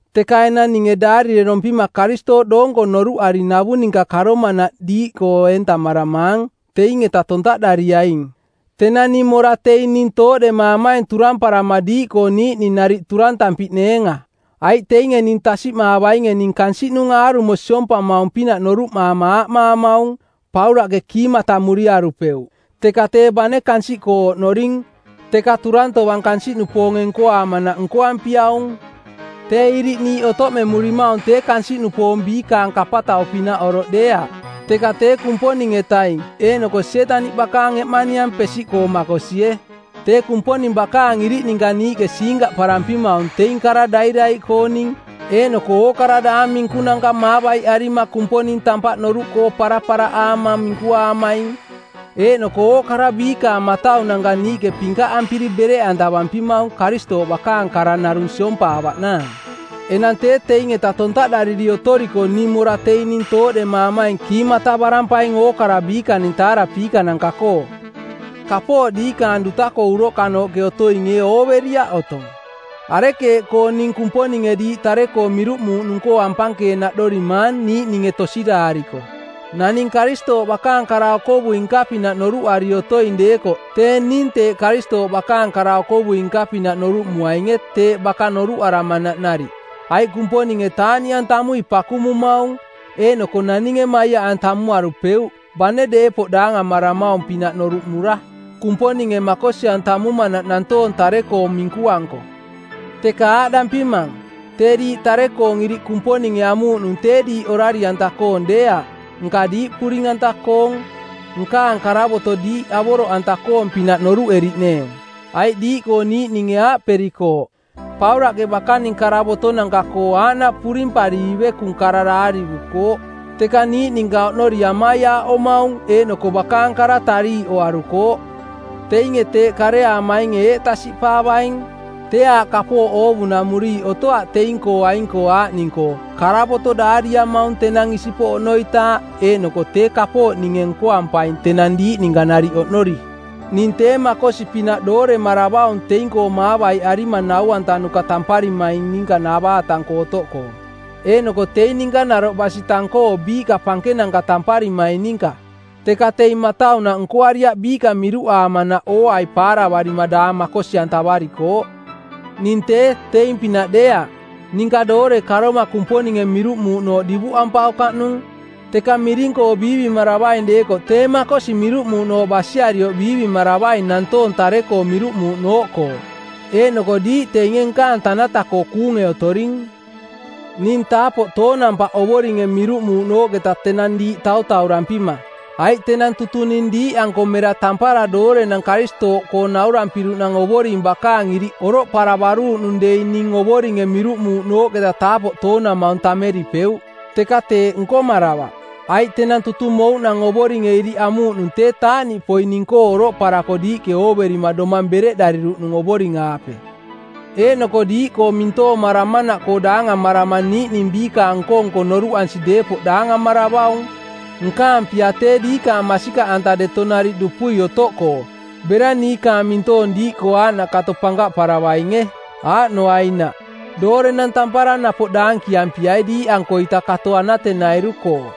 Teka enang ninge daarirerompima Karistooꞌ doonko noruꞌari navu ninka karomanaꞌ diiꞌkoo eentamaramaang teing-eta tontaꞌdariaing. Tenang ning mora teing ning tooꞌdemaamaing turamparama diiꞌkoo niiꞌning nariꞌ turantampiꞌneenga. Aiꞌ teinge ning tasiꞌmaavainge ning kansiꞌnung aarumo siompamaung-pinaꞌ noruꞌmaama aaꞌmaamaung, “Paulaꞌke kiimatamuriarupeuꞌ.” Teka tee bane kansiꞌkoo oꞌnoring, teka turang tovang kansiꞌnupoonge nkoaamanaꞌ nkoampiaung. Tee iriꞌ niiꞌ otoꞌmemurimaung tee kansiꞌnupoong biikaning kapatau-pinaꞌ oroꞌ deeaꞌ, teka tee Kumponing-etaing eeꞌnoko Sietaniꞌ bakaang eꞌmaniang pesiꞌkoo makosie. Tee Kumponing bakaang iriꞌ ninka niiꞌke siinkaꞌparampimaung teing kara dairaiꞌkooning eeꞌnoko ookara daang minkunanka maavaiꞌarima Kumponing tampaꞌ noruꞌkoo paraparaꞌaama minkuaamaing. Eeꞌnoko ookara biikaang mataunanka niiꞌke pinkaꞌampiri bereꞌantavampimaung Karistooꞌ bakaang kara narung siompaavaꞌnaang. Enang tee teing-eta tontaꞌdariri otoriko ning mora teing ning tooꞌdemaamaing kiimatavarampaing ookara biikaning taarapiikananka-koo. Kapooꞌ diikaang duta-koo uroꞌkanooꞌke otoing ee ooveriaꞌ otong? Arekeeꞌkoo ning Kumponinge diiꞌ tare-koo miruꞌmuuꞌnung-koo ampankeenaꞌdorimaang niiꞌninge tosiraariko? Naning Karistooꞌ bakaang kara-okovui-nka-pinaꞌ noruꞌari otoing deekoꞌ tee ning teeꞌ Karistooꞌ bakaang kara-okovui-nka-pinaꞌ noruꞌmuainge teeꞌ baka noruꞌaramanaꞌ nariꞌ. Aiꞌ Kumponinge taaꞌniꞌantamui pakumumaung, eeꞌnoko naninge maiaꞌantamuarupeuꞌ bane deepoꞌ daangamaramaung-pinaꞌ noruꞌmura, Kumponinge makosi-antamumanaꞌ nantoong tare-koo minkuanko. Teka aaꞌdampimang, tee diiꞌ tare-koong iriꞌ Kumponinge amuuꞌnung tee diiꞌ orari-anta-koong deeaꞌ nka diiꞌ puring-anta-koong, nkaang karavoto diiꞌ avoroꞌanta-koong-pinaꞌ noruꞌeriꞌneeng. Aiꞌ diiꞌkoo niiꞌninge aaꞌperikooꞌ, “Paulaꞌke bakaning karavotonanka-koo aaꞌnaꞌ purimpari ivekung kara daarivukooꞌ, teka niiꞌ ninka oꞌnori amaiaaꞌomaung eeꞌnoko bakaang kara tariiꞌoarukooꞌ.” Teinge teeꞌ kareaamainge eeꞌ tasiꞌpaavaing: Tee aaꞌ kapooꞌ oovunamuriiꞌ otoaꞌ teing-koo aing-koo aaꞌning-koo, karavoto daariamaung tenang isipoꞌ oꞌnoitaaꞌ eeꞌnoko tee kapooꞌ ninge nkoampaing tenang diiꞌ ninka nariꞌ oꞌnori. Ning tee makosi-pinaꞌ dooremaravaung teing-koo maavaiꞌarima nau-antanuka tamparimaing ninka navaatang-koo otoꞌkoo, eeꞌnoko teing ninka naroꞌ basi tang-koo biiꞌka pankenanka tamparimaing ninka. Teka teing mataunaꞌ nkoariaꞌ biiꞌka miruꞌaamanaꞌ ooai paaravarima daang makosi-antavarikooꞌ. Ning tee, teing-pinaꞌ deeaꞌ. Ninka doore karoma Kumponinge miruꞌmuuꞌnooꞌ divuꞌampaukaꞌnung. Teka miring-koo biivimaravaing deekoꞌ tee makosi miruꞌmuuꞌnooꞌ basiarioꞌ biivimaravaing nantoong tare-koo miruꞌmuuꞌnooꞌkoo, eeꞌnoko diiꞌ teinge nkaang tanata-koo kuunge otoring. Ning taapoꞌ toonampaꞌ Ovoringe miruꞌmuuꞌnooꞌketa tenang diiꞌ tautaurampima, aiꞌ tenang tutung ning diiꞌanko mera tampara doorenang Karistooꞌkoong naurampiruꞌnang Ovoring bakaang iriꞌ oroꞌparavaruuꞌnung dei ning Ovoringe miruꞌmuuꞌnooꞌketa taapoꞌ toonamaung tammeripeuꞌ. Teka teeꞌ nkomaravaꞌ, aiꞌ tenang tutung mouꞌnang Ovoringe iriꞌ amuuꞌnung tee taaꞌniꞌpoi ning-koo oroꞌparako diiꞌke ooverima domang bereꞌdariruꞌnung Ovoring-aape. Eeꞌnoko diiꞌkoo mintoomaramanaꞌkoo daangamarama niiꞌning biikaang nko-nko noruꞌansi deepoꞌ daangamaravaung. Nkaang pia tee diikaang masikaꞌanta deto nariꞌ dupui otoꞌkoo bera niikaang mintoong diiꞌkoo aaꞌnaꞌ kato pankaꞌparavainge. Aaꞌnoainaꞌ, doorenang tampara napoꞌ daankiampiai diiꞌankoita kato anatenairu-koo.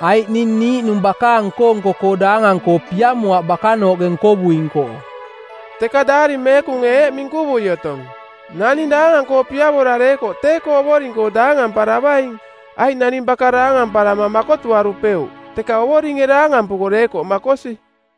Aiꞌ ning niiꞌnung bakaang nko-nko-koo daangang-koo piamoaꞌ bakanooꞌke nkovuing-koo. Teka Daari Meekunge eeꞌ minkuvui otong, “Naning daangang-koo piavora deekoꞌ tee-koo Ovoring-koo daangamparavaing.” Aiꞌ naning baka daangamparama makotuarupeuꞌ, teka Ovoringe daangampuko deekoꞌ makosi.